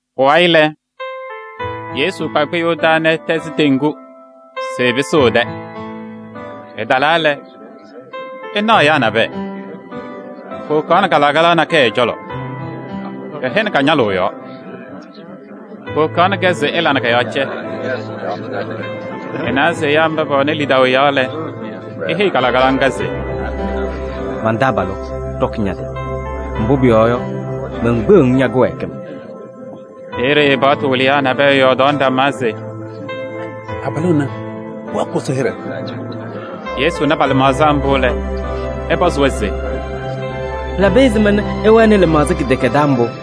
Pʋwayɩ lɛ, Yesu kpa kpɩyʋʋ taa nɛ ɛtɛzɩ teŋgu se ɛpɩsɩɣ ɛ-tɛ. Ɛtalaa lɛ, ɛnaɣ ɛyaa nabɛyɛ, powokaɣnɩ kalɩkalaɣ nakɛyɛ ɛ-cɔlɔ, kɛhɛnɩ ka-ñalʋʋ yɔɔ. Powokaɣnɩ-kɛ se ɛla nɛ kɔ-yɔɔ cɛ. Ɛnawa se ɛyaa mba pɛwɛnɩ lidaʋ ɛ-yɔɔ lɛ, eheyi kalɩkalaɣ ŋga se: “Man-taabalʋ! Ɖɔkɩ ña-tɩ, mbʋ pʋyɔɔ yɔ, menkpeɣ-ŋ ña-kɩwɛɛkɩm.” Peeye paɣtʋ wɩlɩyaa nabɛyɛ yɔɔdaɣnɩ ɖama se: “Abalʋ ɛnɛ ɛwɛɛkɩɣ Ɛsɔ hɩɖɛ!” Yesu na pa-lɩmaɣza mbʋ lɛ, ɛpɔzɩ-wɛ se: “Pɩlabɩ ɛzɩma nɛ ɩwɛnɩ lɩmaɣza kɩdɛkɛdɛɛ mbʋ?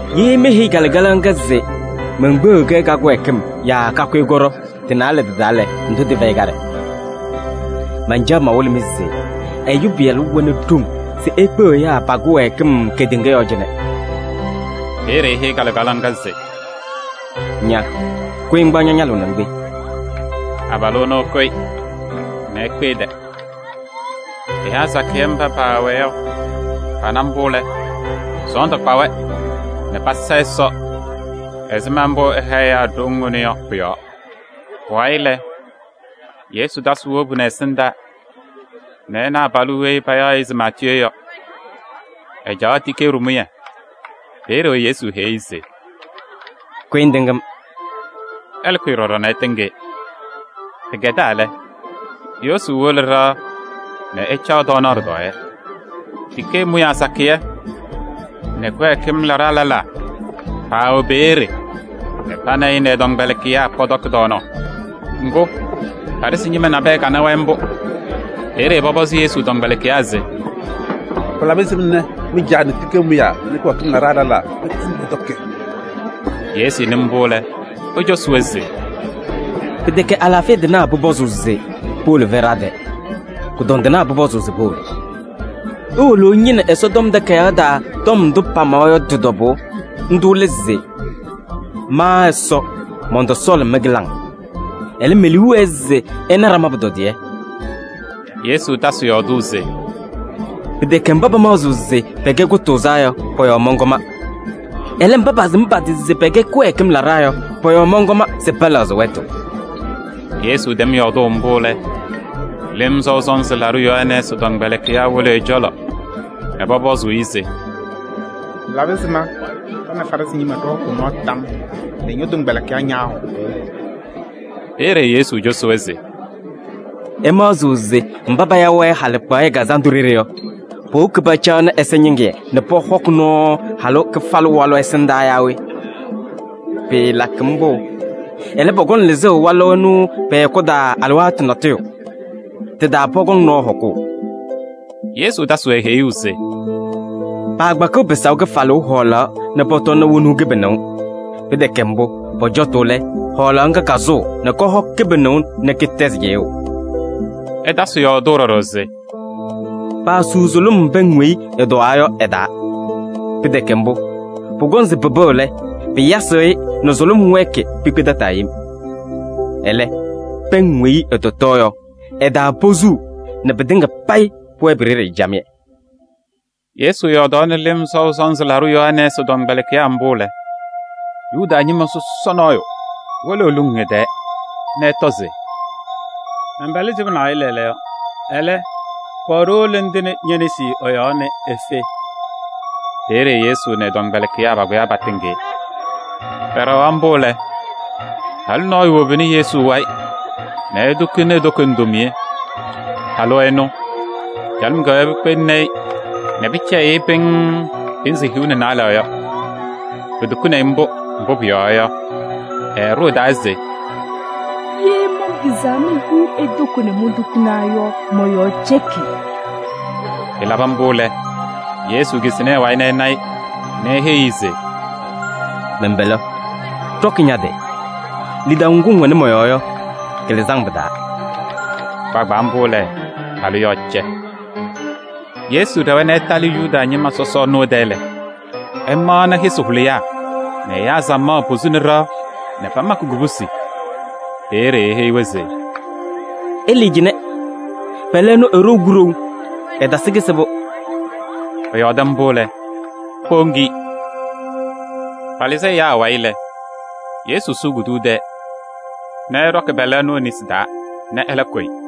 Ye meheyi kalɩkalaɣ ŋga se menkpeɣ-kɛ ka-kɩwɛɛkɩm yaa kakʋyɩ kɔɖɔ, tɩ-naalɛ tɩ-taa lɛ, ndʋ tɩfɛyɩ kaɖɛ? Mancaɣ mawɩlɩ-mɩ se Ɛyʋ Pɩyalʋ wɛnɩ ɖoŋ se ekpeɣ ɛyaa pa-kɩwɛɛkɩm kedeŋa yɔɔ cɩnɛ.” Peeye eheyi kalɩkalaɣ ŋga se: “Ña! Kʋyɩ ŋkpaɣ ña-ñalʋʋ nɛ ŋkpe.” Abalʋ ɛnʋ ɛkʋyɩ nɛ ekpe ɛ-tɛ. Ɛyaa sakɩyɛ mba paawɛɛ yɔ pana mbʋ lɛ, sɔɔndʋ kpa-wɛ nɛ pasa Ɛsɔ ɛzɩma mbʋ ɛha ɛyaa ɖoŋ ɛnʋ yɔ pʋ-yɔɔ. Pʋwayɩ lɛ, Yesu tasɩ wobu nɛ ɛsɩndaa nɛ ɛna abalʋ weyi payaɣ se Maatiyee yɔ, ɛcaɣ tikee ɖɩmʋyɛ. Peeye Yesu heyi-i se: “Kʋyɩ ŋtɩŋ-m!” Ɛlɛ kʋyɩ ɖɔɖɔ nɛ ɛtɩŋ-ɩ. Pɩkɛdaa lɛ, Yesu wolo ɖɩɣa nɛ ɛcaɣ tɔɔnaɣ ɖɩtɔɔyɛ. Tikee mʋyaa sakɩyɛ nɛ kɩwɛɛkɩm laɖaa lɛlaa paawɛ peeye nɛ pa nɛ ɩ nɛ ɛ-tɔmkpɛlɩkɩyaa pɔtɔkɩ tɔɔnaɣ. Ŋgʋ, Farɩsɩ ñɩma nabɛyɛ kana-wɛ mbʋ. Peeye pɔpɔzɩ Yesu tɔmkpɛlɩkɩyaa se: “Pɩlabɩ ɛzɩma nɛ mɩ-caa nɛ tikee mʋyaa nɛ kɩwɛɛkɩm laɖaa lɛlaa pɛkpɛndɩ nɛ pɔtɔkɩ?” Yesu nɩ mbʋ lɛ, ecosi-wɛ se: “Pɩtɛkɛ alaafɩya tɩnaa pʋpɔzʋʋ se powolo fɛɖaa tɛ, kʋdɔndɩnaa pʋpɔzʋʋ se powolo. Iwolo ɩñɩnɩ Ɛsɔtɔm Takayaɣ taa tɔm ndʋ pamawa yɔ tɩ-tɔbʋʋ. Ndʋ lɛ se: ‘Ma Ɛsɔ mɔntɔsɔɔlɩ mɩ-kɩlaŋ, ɛlɛ, me-liu wɛɛ se ɩna ɖama pʋtɔdɩyɛ.’” Yesu tasɩ yɔɔdʋʋ se: “Pɩtɛkɛ mba pamaɣzɩɣ se pɛkɛ kʋtʋʋzaa yɔ pa-wayɩ mɔnkɔma. Ɛlɛ, mba pasɩm pa-tɩ se pɛkɛ kɩwɛɛkɩm laɖaa yɔ pa-wayɩ mɔnkɔm se pɛlɛɣzɩ wɛtʋ.” Yesu tɛm yɔɔdʋʋ mbʋ lɛ, Lɩm Sɔʋ Sɔnzɩ Laɖʋ Yohanɛɛsɩ tɔmkpɛlɩkɩyaa wolo ɛ-cɔlɔ nɛ pɔpɔzʋʋ-ɩ se: “Pɩlabɩ ɛzɩma ɖa nɛ Farɩsɩ ñɩma ɖɩhɔkʋʋ nɔɔ tam nɛ ñɔ-tɔmkpɛlɩkɩyaa ñaahɔkʋʋ?” Peeye Yesu cosi-wɛ se: “Ɩmaɣzɩɣ se mba paya-wɛ halɩkpaɣyɛ kazandʋ ɖeɖe yɔ, powoki pacaɣnɩ ɛza ñɩŋɩyɛ nɛ pɔhɔkɩ nɔɔ halʋ kɩfalʋ walʋ ɛsɩndaa yaa we? Pɩɩlakɩ mbʋ! Ɛlɛ, pɔkɔŋ lɩzʋʋ walʋ ɛnʋ pɛ-hɛkʋ taa alɩwaatʋ natʋyʋ. Tɩ-taa pɔkɔŋ nɔɔ hɔkʋʋ.” Yesu tasɩ-wɛ heyuu se: “Paakpakɩɣ pɩsaʋ kɩfalʋʋ hɔɔlaɣ nɛ pɔtɔnɩ wonuu kɩbɩnʋʋ. Pɩtɛkɛ mbʋ, pɔcɔtʋʋ lɛ, hɔɔlaɣ ŋga kasʋʋ nɛ kɔhɔ kɩbɩnʋʋ nɛ kɩtɛzɩ cɩyʋʋ.” Ɛtasɩ yɔɔdʋʋ ɖɔɖɔ se: “Paasuu sʋlʋm pɛŋ weyi ɩtɔwaa yɔ ɩ-taa. Pɩtɛkɛ mbʋ, pʋkɔŋ se pɩpɩɣ yɔ, pɩyasɩɣ-ɩ nɛ sʋlʋm wɛɛkɩ pikpe tataa yem. Ɛlɛ, pɛŋ weyi ɩtɔtɔɔ yɔ, ɩ-taa posuu nɛ pɩtɩŋa payɩ pʋwɛɛ pi-ɖeɖe camɩyɛ.” Yesu yɔɔdaɣnɩ Lɩm Sɔʋ Sɔnzɩ Laɖʋ Yohanɛɛsɩ tɔmkpɛlɩkɩyaa mbʋ lɛ, Yuda ñɩma sɔsɔ nɔɔyʋ wolo eluŋ ɛ-tɛɛ nɛ ɛtɔ se: “Mɛn-pɛlɛ sɩba naɣ yɔ lɛɛlɛɛyɔ. Ɛlɛ, kɔɔ ɖiwolo nɛ ŋtɩnɩ ñe-nesi ɛ-yɔɔ nɛ efe.” Peeye Yesu nɛ ɛ-tɔmkpɛlɩkɩyaa pakʋyaa patɩŋ-ɩ. Pɛɖɛɣaɣ mbʋ lɛ, halʋ nɔɔyʋ wobini Yesu wayɩ nɛ etukuni e-toko ndomiye. Halʋ ɛnʋ, calɩm kɛwɛɛ pikpeŋni-i nɛ pɩcɛyɩɣ-ɩ pɩŋŋ pɩnzɩ hiu nɛ naalɛ yɔ. Etukuni-i mbʋ, mbʋ pʋyɔɔ yɔ, ɛɖʋ ɛ-taa se: “Ye manpɩzaa mehiɣ e-toko nɛ montukina yɔ, mɔ-yɔɔ cɛkɩ.” Ɛlabɩ mbʋ lɛ, Yesu kisi nɛ ɛ-wayɩ nɛ ɛna-ɩ nɛ eheyi-i se: “Mɛn-pɛlɛ! Ɖɔkɩ ña-tɩ! Lidaʋ ŋgʋ ŋwɛnɩ mɔ-yɔɔ yɔ, kɩlɩzɩ-ŋ pɩ-taa.” Kpaagbaa mbʋ lɛ, halʋ yɔɔ cɛ. Yesu ɖɛwa nɛ ɛtalɩ Yuda ñɩma sɔsɔ ɛnʋ ɛ-tɛ lɛ, ɛmaɣnɩ yɩsɩ hʋlɩyaa nɛ ɛyaa samaɣ posuni ɖɩɣa nɛ pamakɩ kubusi. Peeye eheyi-wɛ se: “Ɩlɩɩ cɩnɛ, pɛlɛ ɛnʋ eɖou kuɖou, ɛtasɩ kɩsɩbʋ.” Ɛyɔɔdɩ mbʋ lɛ, powoŋ-i. Palɩzɩ ɛyaa awayɩ lɛ, Yesu sʋʋ kuduyuu tɛɛ nɛ ɛɖɔkɩ pɛlɛ ɛnʋ e-nesi taa nɛ ɛlɛ kʋyɩ.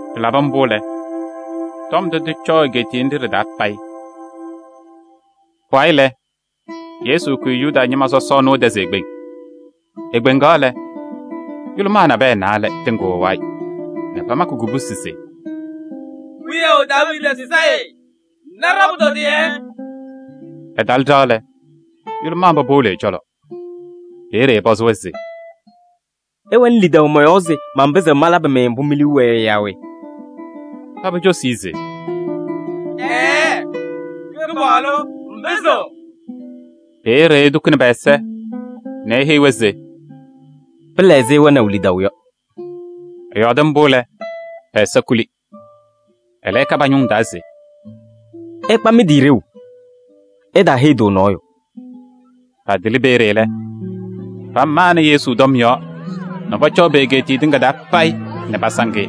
Pɩlabɩ mbʋ lɛ, tɔm ndʋ tɩcɔɔ egeetiye nɖɩ ɖɩ-taa payɩ. Pʋwayɩ lɛ, Yesu kʋyɩ Yuda ñɩma sɔsɔ ɛnʋ ɛ-tɛ se ekpeŋ. Ekpeŋaɣ lɛ, yʋlʋmaa naalɛ nabɛyɛ tɩŋɩɣ ɛ-wayɩ nɛ pamakɩ kubusi se: “Wiyaʋ Daaviidi Sayɩ! Na ɖa-pʋtɔdɩyɛ.” Ɛtalɩ ɖɩɣa lɛ, yʋlʋmaa mba powolo ɛ-cɔlɔ. Peeye ɛpɔzɩ-wɛ se: “Ɩwɛnɩ lidaʋ mɔ-yɔɔ se manpɩzɩɣ malabɩ-mɩ mbʋ mi-liu wɛɛ yɔ yaa we?” Paba cosi-i se: “Ɛɛɛ, Kɩpaɣlʋ ŋpɩzɩɣ.” Peeye etukuni pɛ-ɛza nɛ eheyi-wɛ se: “Pɩla ɛzɩ ɩwɛnaʋ lidaʋ yɔ.” Ɛyɔɔdɩ mbʋ lɛ, pɛ-ɛza kuli. Ɛlɛ ɛka pa-ñʋŋ taa se: “Ɩkpa mɩ-tɩ ɖeu, ɩtaaheyi-tʋ nɔɔyʋ.” Patɩlɩ peeye lɛ, pamanɩ Yesu tɔm yɔɔ nɛ pɔcɔɔ pe-egeetiye tɩŋa taa payɩ nɛ pasaŋ-ɩ.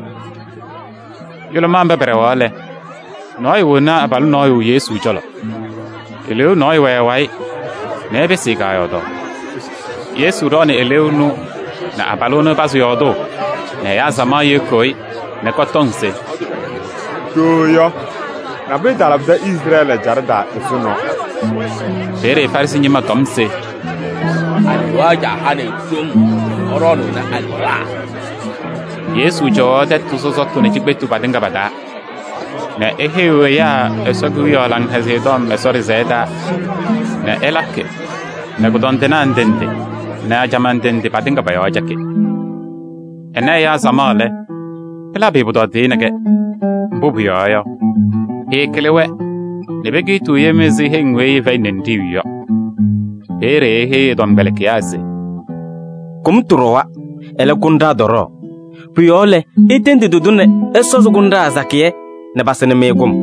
Yʋlʋmaa mba pɛɖɛɣaɣ lɛ, nɔɔyʋ woni abalʋ nɔɔyʋ Yesu cɔlɔ. Eleeu nɔɔyʋ wɛ ɛ-wayɩ nɛ ɛpɩsɩ-ɩ kaayɔɔdaɣ. Yesu ɖɔɔnɩ eleeu ɛnʋ nɛ abalʋ ɛnʋ ɛpazɩ yɔɔdʋʋ nɛ ɛyaa samaɣ yɩɣyɩɣ-ɩ nɛ kɔtɔŋ se: “Ɖooo yɔ, nabʋyʋ talabɩdɩ Izrɛɛlɩ ɛjaɖɛ taa ɛzʋnɔ!” Peeye Farɩsɩ ñɩma tɔm se: “Alewaa caa hanɩ-ɩ ɖoŋ nɛ ɛɖɔɔnʋʋnɩ alewaa.” Yesu cɔwaɣ tɛtʋ sɔsɔtʋ nɛ cikpetu patɩŋa pa-taa nɛ eheyiɣ ɛyaa Ɛsɔ Kewiyaɣ Laŋhɛzɩyɛ Tɔm Ɛsɔ ɖɩsɛyɛ taa nɛ ɛlakɩ nɛ kʋdɔndɩnaa ndɩ ndɩ nɛ ajamaa ndɩ ndɩ patɩŋa pɔ-yɔɔ cɛkɩ. Ɛna ɛyaa samaɣ lɛ, pɩlabɩ-ɩ pʋtɔdɩyɛ nɛ kɛ. Mbʋ pʋyɔɔ yɔ, pɩɩkɩlɩ-wɛ nɛ pekiitiɣ yem ɛzɩ heŋ weyi ɩfɛyɩnɩ ninɖiɣyu yɔ. Peeye eheyi ɛ-tɔmkpɛlɩkɩyaa se: “Kʋmtʋ ɖɔwa, ɛlɛ, kʋnɖaa tɔɖɔɔ. Pʋ-yɔɔ lɛ, itendi tɩ-tʋ nɛ ɛsɔzɩ kʋnɖaa sakɩyɛ nɛ pasɩnɩ-mɩ kʋm.”